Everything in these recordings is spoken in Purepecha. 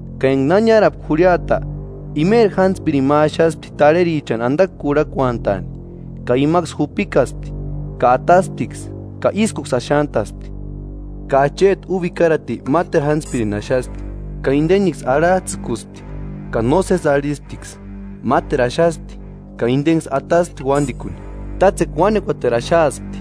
Ka enga na niárapka jurhiata, imeri jántspirini ma axaspti tarherichani andakua kurhakuantaani. Ka imaksï jupikaspti, ka atasptiksï, ka ískuksï axantaspti. Ka acheti úba ikarati máteru jántspirini axaspti, ka indeniksï arhajtsïkuspti, ka nósesi arhisptiksï. Máteru axaspti, ka indeniksï ataspti uándikuni. Tátsekua Uánekuateru axaaspti;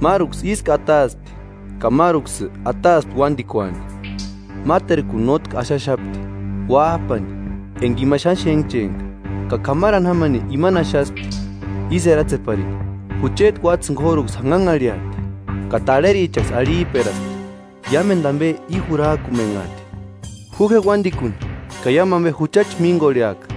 máruksï ísku ataaspti, ka máruksï ataaspti uándikuani.” “Máterkuni nótki axaxapti: Uájpani, enga ima xáni xénhchempka. Ka k'amarani jámani imani axaspti, ísï eratseparini: ‘Jucheti uátsïni k'óruksï janhanharhiati.’ Ka tarherichaksï arhijperaspti: ‘Iámendu ambe i jurajkumenhaati; ju je uándikuni ka iámu ambechi jucha míngorheaka.’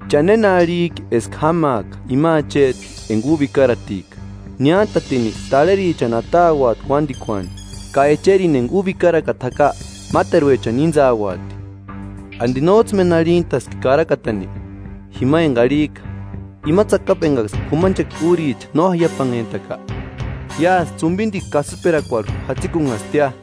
“¿Cha néna arhijki eska jámaaka ima acheti enga úba ikaratika? Niántatini tarherichani atauati uándikuani, ka echerini enga úba ikarakata jaka máteruechani íntsauati.” “¿Andi nójtsï méni arhitaski karakatani? Jima enga arhijka: ‘Ima tsakapu engaksï k'umanchekua úricha no jaiapanhentaka, iásï tsumbindikua kasïperakuarhu jatsikunhastia.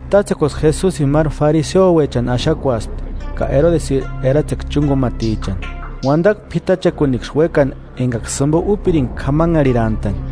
Tátsekuaksï Jesusini máru fariseuechani axakuaspti ka erodesiri eratsekua chúngumatichani, uandakua p'itachakuniksï uékani engaksï jimbo úpiringa k'amanharhirantani.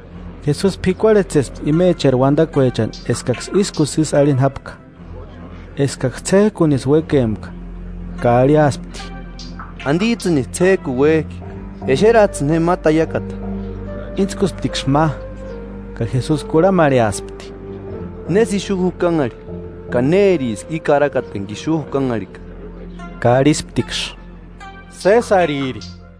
Jesusi p'ikuarhetsespti imecheri uandakuechani eskaksï ískusï ísï arhini jápka, eskaksï ts'éjkunisï uékempka, ka arhiaspti: –¿Andijtsïnisï ts'éjkuni uéjki? Exerajtsïni je ma taiakata. Íntskusptiksï ma, ka Jesusi kurhamarheaspti: –¿Nésï ixu jukanhari ka nériski i karakata enga ixu jukanharhika? Ka arhisptiksï: –Sésariri.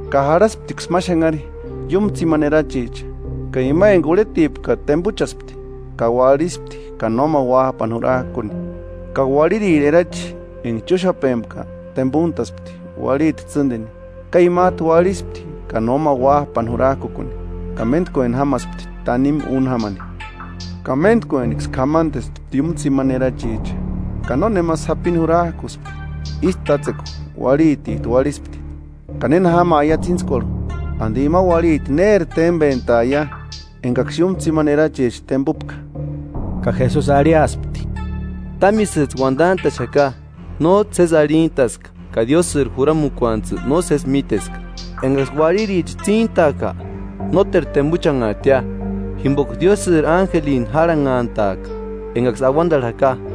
Ka jarhasptiksï ma xanhari, iúmu tsimani erachicha, ka ima enga urhetipka tembuchaspti, ka uarhispti ka nóma uájpani jurajkuni. Ka uarhiriri erachi enga chúxapempka tembuntaspti uarhiti tsîndini ka imajtu uarhispti ka no ma uájpani jurajkukuni. Ka méntkueni jámaspti tanimu úni jámani, ka méntkueniksï k'amandespti iúmu tsimani erachicha; ka nónema sapini jurajkuspti. Ísï tátsekua uarhitijtu uarhispti. Ka néna jámaia tsíntskuarhu, ¿Andi ima uarhiti néri tembentaia engaksï iúmu tsimani erachicha tembupka? Ka Jesusi arhiaspti: –Támisïjtsï uandantaxaka, nójtsï sési arhitaska ka Diósïri juramukuantujtsï nósesi míteska. Engaksï uarhiricha tsíntaaka, nóteru tembuchanhaatia, jimboka Diósïri ánjelini járhanhantaaka, engaksï auandarhu jaka.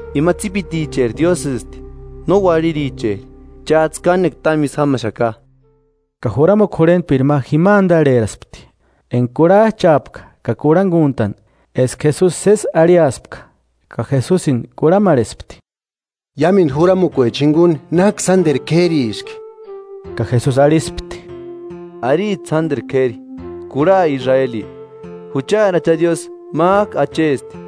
Ima tsípiticheri Diósïsti, no uarhiricheri. Chájtsï kánekua támu ísï jámaxaka. Ka juramukua jurhentpiri ma jima andarheraspti enga kurhajchaapka ka kurhanguntani eska Jesusi sési arhiaspka, ka Jesusini kurhamarhespti: –Iámendu juramukuecha jinguni ¿Náki sánderu k'ériski? Ka Jesusi arhispti: –Aristi sánderu k'éri: Kurha Israeli: Juchari Acha Diósï, májku Achesti;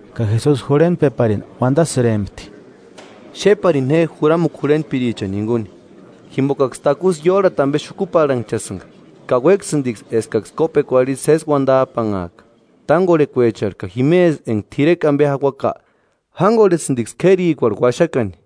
Ka Jesusi jurhentpeparini uandasïrempti: “Xéparini je juramukua jurhentpirichani jinguni, jimbokaksï takusï iórhati ambe xukuparhanchasïnga, ka uéksïndiksï eskaksï kópekuarhu isï sési uandajpanhaaka. Tángorhekuecharhu ka jimesï enga t'irekua ambe jauaka, jángorhesïndiksï k'érikuarhu uaxakani;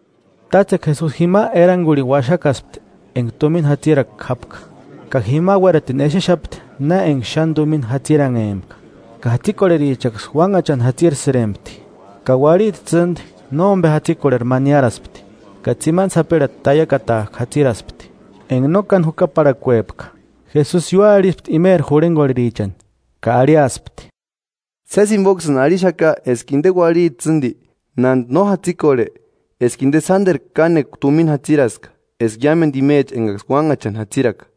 Tátsekua Jesusi jima erangurhini uaxakaspti enga tumina jatsirakua jápka, ka jima uératini exexapti na enga xáni tumina jatsiranhempka, ka jatsikorherichaksï uánhachani jatsirsïrempti. Ka uarhiti tsîndi nómbe jatsikorheri ma niáraspti, ka tsimani sapirhati taiakatajku jatsiraspti, enga no káni jukaparhakuepka. Jesusi ióarhiaspti imeri jurhengorherichani, ka arhiaspti: –Sési jimboksïni arhixaka eska inde uarhiti tsîndi, nándi no jatsikorhe, eska inde sánderu kánekua tumina jatsiraska eska iámendu imecha engaksï uánhachani jatsiraka;